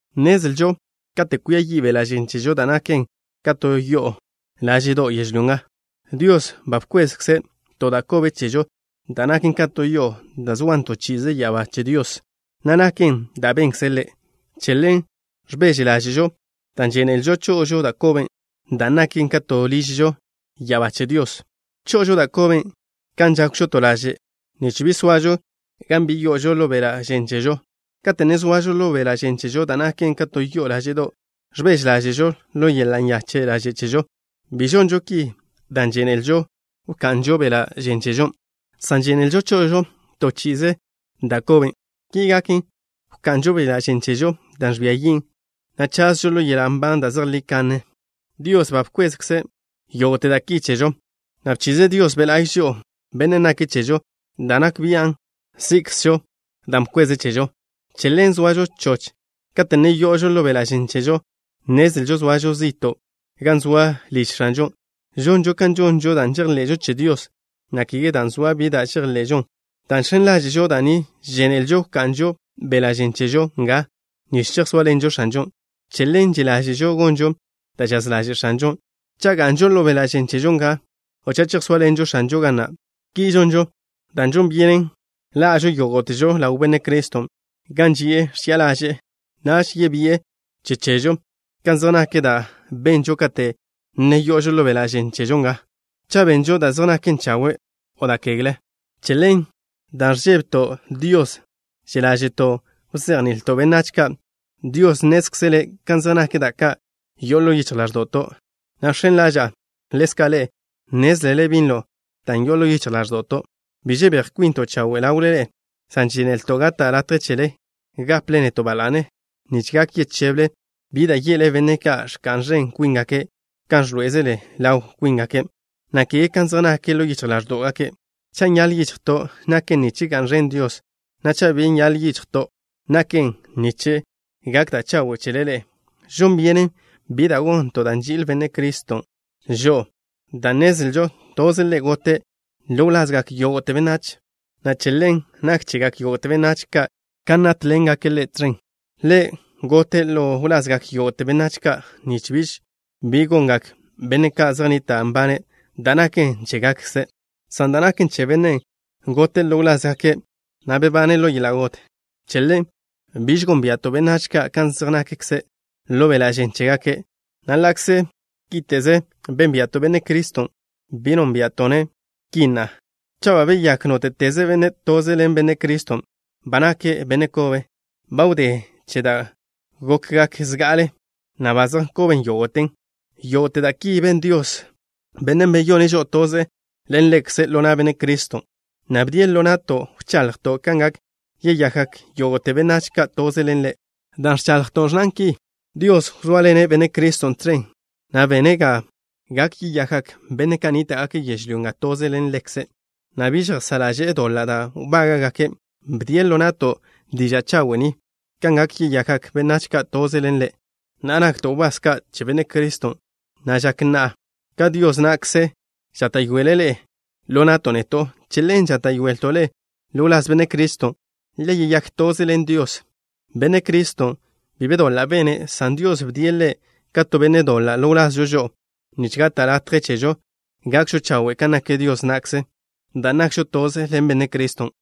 Nnezlžo kate' kwia yi' beḻa' žen chežo, da' naken ka to yo'o láže'do' yežlyó nga, Dios ba bkweze' to da' kobe chežo, da' naken ka to yo'o, dan' zoan to chi'ize ya'abá che Dios, na' naken dan' benkze' Ḻe'. Che ḻen ẕbeže ḻáže'žo dan' žénelžo cho'ožo da' koben', dan' naken ka to ližžo ya'abá che Dios. Cho'ožo da' koben' kan žákwžo to laže', nich bi soažo gan bi yo'ožo ḻo beḻa' žen chežo. Kate' ne zoažo ḻo beḻa' žen chežo, da' naken ka to yo'o láže'do', ẕbeže ḻáže'žo ḻo yeḻa' nyache' ḻaže' chežo. Bi žonžo ki dan' žénelžo wka'nžo beḻa' žen chežo, san žénelžo cho'ožo to chi'ize da' koben'. Ki gaken, wka'nžo beḻa' žen chežo da' ẕbia yin', na' chazžo ḻo yeḻa' nban da' zejlí kanne. Dios ba bkweze' yógo'te da' ki chežo, na' bchize' Dios Be' La'y žo'o, Bennen' nake' chežo da' nak bian' sí'kzežo dan' bkweze' chežo. Che ḻen zoažo choch. Kate' ne yo'ožo ḻo beḻa' žen chežo, nnezlžo zoažo zi'to' gan zoa liž X̱anžon'. Žonžo kan žonžo dan' žejḻe'žo che Dios, na' kege dan' zoa bi da' ẕḻe'elžon. Dan' žx̱en ḻáže'žo da' ni, žénelžo wka'nžo beḻa' žen chežo nga nich chejsóaḻenžo X̱anžon'. Che ḻen že' ḻáže'žo gonžo da' žaz ḻaže' X̱anžon', cha' ga'nžo ḻo beḻa' žen chežo nga, o cha' chejsóaḻenžo X̱anžon' ga na'. Ki žonžo dan' žon byenen ḻa'žo yógo'težo ḻaw Benne' Criston' gan ži'e ẕchi'a ḻaže'e. Naž yebi'e che chežo kan zej nak da' benžo kate' ne yo'ožo ḻo beḻa' žen chežo nga, cha' benžo da' zej naken chawe' o da' kegle. Che ḻen, dan' ẕžébeto' Dios, že' ḻáže'to' wzejni'ilto' benách ka'. Dios nnézkzele' kan zej nak da' ka' yo'o ḻo yichj ḻáẕdo'to', na' žx̱en ḻaža'a ḻezka' ḻe'e nnézlele binlo dan' yo'on ḻo yichj ḻáẕdo'to'. Bi žebéj kwinto' chawe' ḻawle ḻe'e, san žénelto' gata' latje chele gaple neto' ba la'ne, nich gak yecheble, bi da' ye'le benne' ka' ẕka'n ẕen kwíngake' kan ẕḻoé'eze ḻaw kwíngake', na' kege kan zej nake' ḻo yichj ḻáẕdo'gake'. Cha' nyaḻ yichjto', naken nich ga'n ẕen Dios, na' cha' bi nyaḻ yichjto', naken nich gak da' chawe' chele ḻe'e. Žon byenen bi da' gonto' dan' nži'il Benne' Criston' žo'o, dan' nnezlžo toze' Ḻe' gote' ḻo wlazgak yógo'te benách, na' che ḻen nak chegak yógo'te benách ka' kan nátḻengake' Ḻe' tẕen. Ḻe' gote' ḻo wlazgak yógo'te benách ka' nich biž bi gongak benne' ka' zej nnita' nbane' da' naken chégakze', san da' naken che Bennen' gote' ḻo wlázgake', na' bebane' ḻo yeḻa' got. Che ḻen, biž gónbia'to' benách ka' kan zej nakze' ḻo beḻa' žen chégake', na' ḻa'kze kíte'ze bénbia'to' Benne' Criston', bi nónbia'to'-ne' ki na'a. Cha' ba beyák nóte'teze benne' toze ḻen Benne' Criston', ba nake' benne' kobe. Ba wdé che da' gokgak zga'ale, na' ba zej nkoben yógo'ten. Yógo'te da' ki ben Dios, Bennen' beyone' žo'o toze ḻen Ḻekze' ḻo na' Benne' Criston', na' bdie' ḻo na'to' wchaḻjto' kan gak yeyakgak yógo'te benách ka' toze ḻen Ḻe'. Da' ẕchaḻjto' ẕnnan ki: “Dios wzóaḻene' Benne' Criston' tẕen, na' bene' ga gak yeyakgak benne' ka' nníta'gake' yežlyó nga toze ḻen Ḻekze', na' bi žejsá' ḻaže'e doḻa' da' wbága'gake'.” Bdie' ḻo na'to' diža' chawe' ni, kan gak yeyakgak benách ka' toze ḻen Ḻe'. Na'a, nakto' wbás ka' che Benne' Criston', na' žak na'a ka Dios na'kze žáta'yoele' ḻe'e ḻo na'to' neto'. Che ḻen žáta'yoelto' ḻe'e ḻo wláz Benne' Criston', le yeyák toze ḻen Dios. Benne' Criston' bi be doḻa' bene', san Dios bdie' Ḻe' ka to benne' doḻa' ḻo wlazžo žo'o nich gata' latje chežo gakžo chawe' kan nak Dios na'kze, dan' nakžo toze ḻen Benne' Criston'.